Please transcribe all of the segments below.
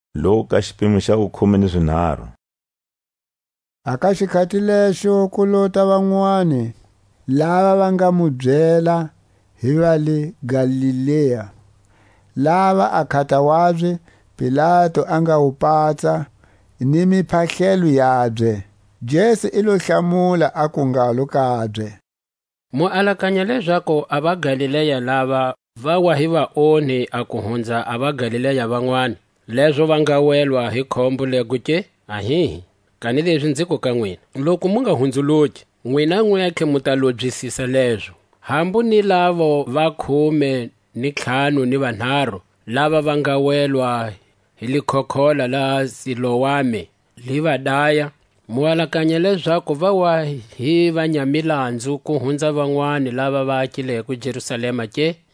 Mu ta lova loku mu nga hunzuluki. A ka xikhati lexo ku lota vanwani lava va nga mu byela hi va le Galilea, lava a nkhata wabye Pilatu a nga wu patsa ni miphahlelo yabye. Jesu i lo hlamula aku ngalo kabye: Mu alakanya lezaku a vaGalilea lava va wa hi vaonhi a ku hunza a vaGalilea vanwani, lezo va nga welwa hi khombo lego ke? Ahihi, kanilezi nziku ka nwina: Loku mu nga hunzuluki, nwina nwentlhe mu ta lobyisisa lezo. Hambu ni lavo va khume ni ntlhanu ni vanharu, lava va nga welwa hi likhokhola la Siloame, li va daya; mu alakanya lezaku va wa hi vanyamilanzu ku hunza vanwani lava va akileko Jerusalema ke?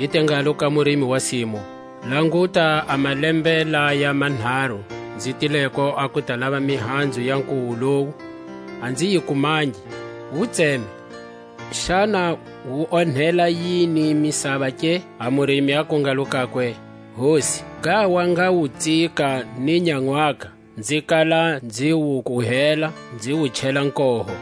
I te ngalo ka murimi wa simu: Languta, a malembe laya manharu nzi tileko a ku ta lava mihanzu ka nkuwu lowu, a nzi yi kumangi; wu tseme, xana wu onhela yini misava ke? A murimi aku ngalo kakwe: Hosi, ngha wa nga wu tsika ni nyanwaka, nzi kala nzi wu kuhela, nzi wu chela koho;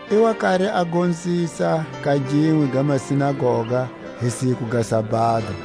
I wa kari a gonzisa ka ginwe ga masinagoga hi siku ga sabado,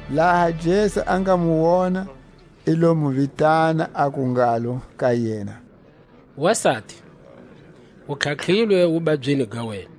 Laha Jesu a nga mu wona, i lo mu vitana, aku ngalo ka yena: Wasati, u tlhatlhilwe wubabyini ga wena.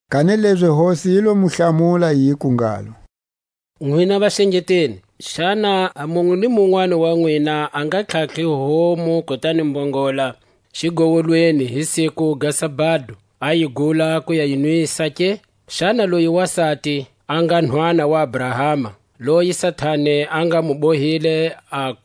Kanilezi Hosi yi lo mu hlamula, yiku ngalo: Nwina vaxengeteli, xana a munwe ni munwani wa nwina a nga tlhatlhi homu kutani mbongola xigowolweni hi siku ga sabado, a yi gula ku ya yi nwisa ke? Xana loyi wasati, a nga nhwana wa Abrahama, loyi Satani a nga mu bohile a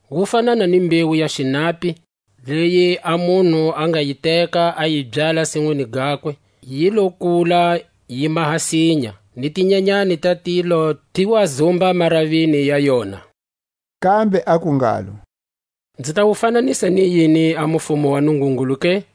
Wu fanana ni mbewu ya xinapi, leyi a munhu a nga yi teka a yi byala sinwini gakwe; yi lo kula, yi maha sinya, ni tinyanyani ta tilo ti wa zumba maravini ya yona. Kambe aku ngalo: Nzi ta wu fananisa ni yini a mufumo wa Nungungulu ke?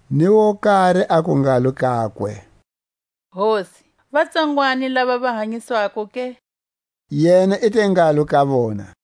Ni wo kari aku ngalo kakwe: Hosi, va tsongwani lava va hanyiswako ke? Yena i te ngalo ka vona: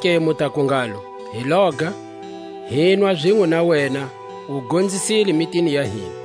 Zonake mu taku ngalo: Hi loga, hinwa zinwe na wena, u gonzisile mitini ya hina.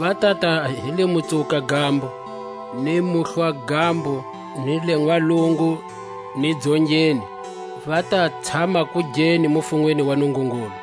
Va tata hi le Mutsuwuka-gambo, ni Muhlwa-gambo, ni le Nwalungu, ni Dzongeni, va ta tshama kugeni mufunweni wa Nungungulu.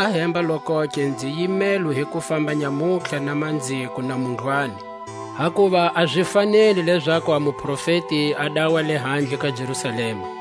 Ahemba-lokoke, nzi yimelwe hi ku famba nyamutlha na manziko na mundlwani; hakuva a zi faneli lezaku a muprofeti a dawa lehandle ka Jerusalema.